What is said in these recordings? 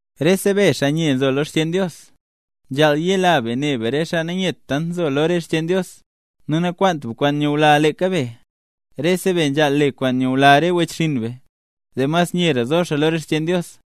Rese be, xaa nye nzo lo re xcheen Dios, nzhaal yela be ne be re xaa nanyet tant nzo lo re xcheen Dios; nu nakwaant be kwaan nyula leeka be. Rese be nzhaal le be kwaan nyula re wechxinn be, zee mas nyera zo xaa lo re xcheen Dios.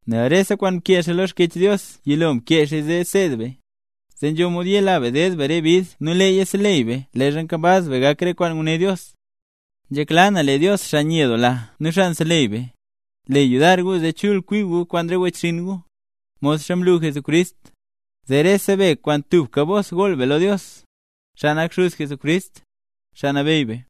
Nel rese kwaan mkee xaa lo Xkyech Dios yilo mkeeya zee seed be; zee nzho mod yela be ded be re bid nu leeya seleyy be leezha nkambaz be gak re kwaan nguné Dios. Nzhekla na lee Dios, xaa nyedoola nu xaa nseleyy be, le yudar gu zee chul kwi gu kwaan re wechxinn gu, modxa mlu Jesucrist, zee rese be kwaan tubka bos gool be lo Dios, xaa nak xuz Jesucrist, Xaa Nabeyy be.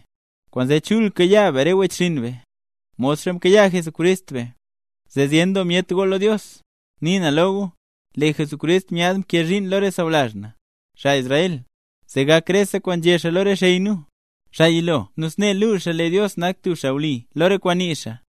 Kwaanzee, chul kayaa be re wechxinn be, modxa mkayaa Jesucrist be, zee zyen doo myet gool lo Dios. Nii na lo gu, lee Jesucrist myaad mkee zhiin lo re sawlazh na, xaa Israel, zee gak rese kwaan nzhé xaa lo re xey nu, xaa yilo nu snee luu xaa lee Dios nak tub xaa wli lo re kwaan nii xaa.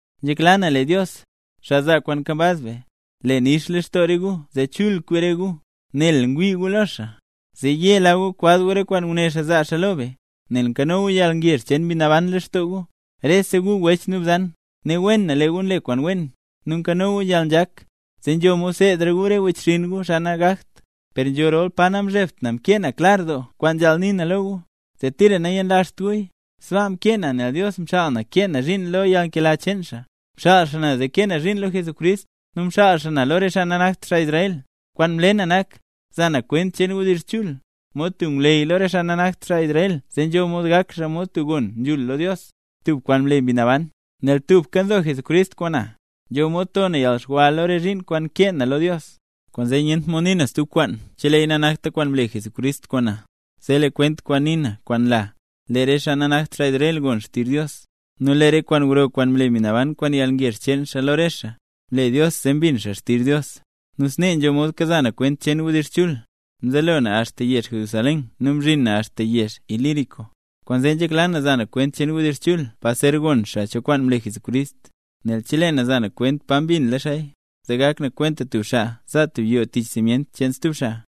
Nzhekla na lee Dios, xaa zaa kwaan nkambaz be, le nix lextoo re gu zee chul kwi re gu, nel ngwii gu lo xaa, zee yela gu kwaz gu re kwaan nguné xaa zaa xaa lo be, nel nkano gu yalngezh cheen Mbi Naban lextoo gu. Rese gu wech nu bzan, ne wen na lee gu nle kwaan wen, nu nkano gu yalnzhak, zee nzho mod seedra gu re wechxinn gu, xaa nagakt. Per nzho rol pa namzhebt na mkee na klar doo kwaan nzhaal nii na lo gu, zee tira nayenlazht guya; sbaa mkee naya nel Dios mxaal na kee na zhiin ne lo yalnkela cheen xaa. Mxaal xaa na, zee kee na zhiin lo Jesucrist, nu mxaal xaa na lo re xaa nanakt xaa Israel. Kwaan nle na nak, za na kwent cheen wdizh chul, mod tub ngwleyy lo re xaa nanakt xaa Israel zee nzho mod gak xaa mod tub gon nzhul lo Dios, tub kwaan mle Mbi Naban. Nel tubka nzo Jesucrist kwaan na, nzho mod to na yalxwa lo re zhiin kwaan nkee na lo Dios. Kwaanzee nyent mod nii na stub kwaan cheleeya nanakta kwaan mle Jesucrist kwaan na, zee lee kwent kwaan nii na nu kwaan nle na, lee re xaa nanakt xaa Israel gon xtizh Dios, nu lee re kwaan gro kwaan mle Mbi Naban kwaan yalngezh cheen xaa lo re xaa, mle Dios zee mbin xaa xtizh Dios. Nu snee nzho mod kaza na kwent cheen wdizh chul; mzelo na axta yezh Jerusalén nu mzhin na axta yezh Ilírico. Kwaanzee nzhekla na za na kwent cheen wdizh chul pa zer gon xaa cho kwaan mle Jesucrist. Nel chelee na za na kwenta pa mbinla xaaya, zee gak na kwenta tub xaa za tub yoo tich simyent xcheen stub xaa.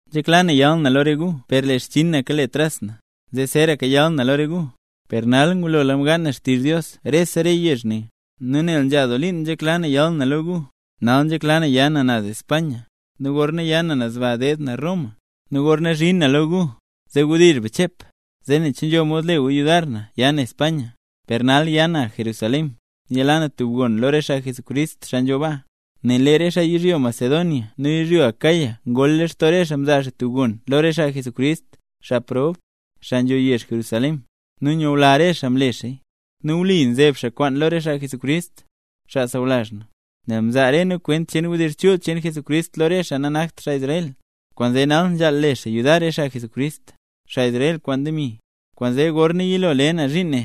Nzhekla na yal na lo re gu per lee xchinn na kale tras na, zee zeeraka yal na lo re gu. Per nal, ngulola mgaan na xtizh Dios re yezh ne; nu nel nzha doo liin nzhekla na yal na lo gu, nal nzhekla na ya na naz España, nu gorna ya na naz ba deed na Roma. Nu gorna zhin na lo gu, zee wdizh be chep, zee nen che nzho mod le gu yudar na ya na España. Per nal ya na Jerusalén, yalaa na tub gon lo re xaa mle Jesús nambey, xaa nzho baa. Nel lee re xaa yizhyo Macedonia nu yizhyo Acaya ngol lextoo re xaa mzaa xaa tub gon lo re xaa Jesús, xaa prob, xaa nzho yezh Jerusalén. Nu myula re xaa mle xaaya. Nu wli nzeeb xaa kwaan lo re xaa Jesucrist, xaa sawlazh na, nel mzaa re nu kwent cheen wdizh chul cheen Jesucrist lo re xaa nanakt xaa Israel, kwaanzee nal nzhaal le xaa yudar re xaa Jesucrist, xaa Israel kwaan demi. Kwaanzee gorna yilo le na zhiin ne,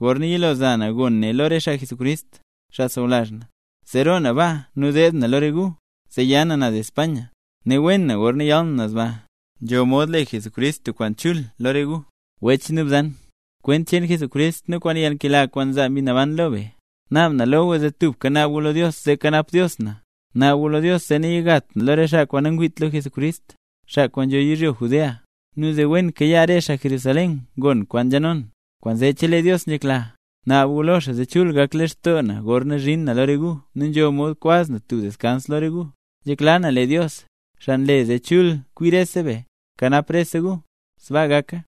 gorna yilo za na gon ne lo re xaa Jesucrist, xaa sawlazh na; zee roo na baa nu deed na lo re gu, zee ya na naz España. Ne wen na gorna yal na naz baa, nzho mod le Jesucrist tub kwaan chul lo re gu. Wech nu bzan, kwent cheen Jesucrist nu kwaan yalnkela kwaan nzaa Mbi Naban lo be, naab na lo gu zee tubka naab gu lo Dios zee kanap Dios na. Naab gu lo Dios zee nayigat na lo re xaa kwaan nangwiit lo Jesucrist, xaa kwaan nzho yizhyo Judea, nu zee wen kayaa re xaa mle Jesús nambey, xaa Jerusalén, gon kwaan nzhano na. Kwaanzee chelee Dios nzhekla, naab gu lo xaa zee chul gak lextoo na gorna zhin na lo re gu nu nzho mod kwaz na tub deskans lo re gu. Nzhekla na lee Dios, xaa nle zee chul kwi rese be, kanap rese gu. ¡Sbaa gaka!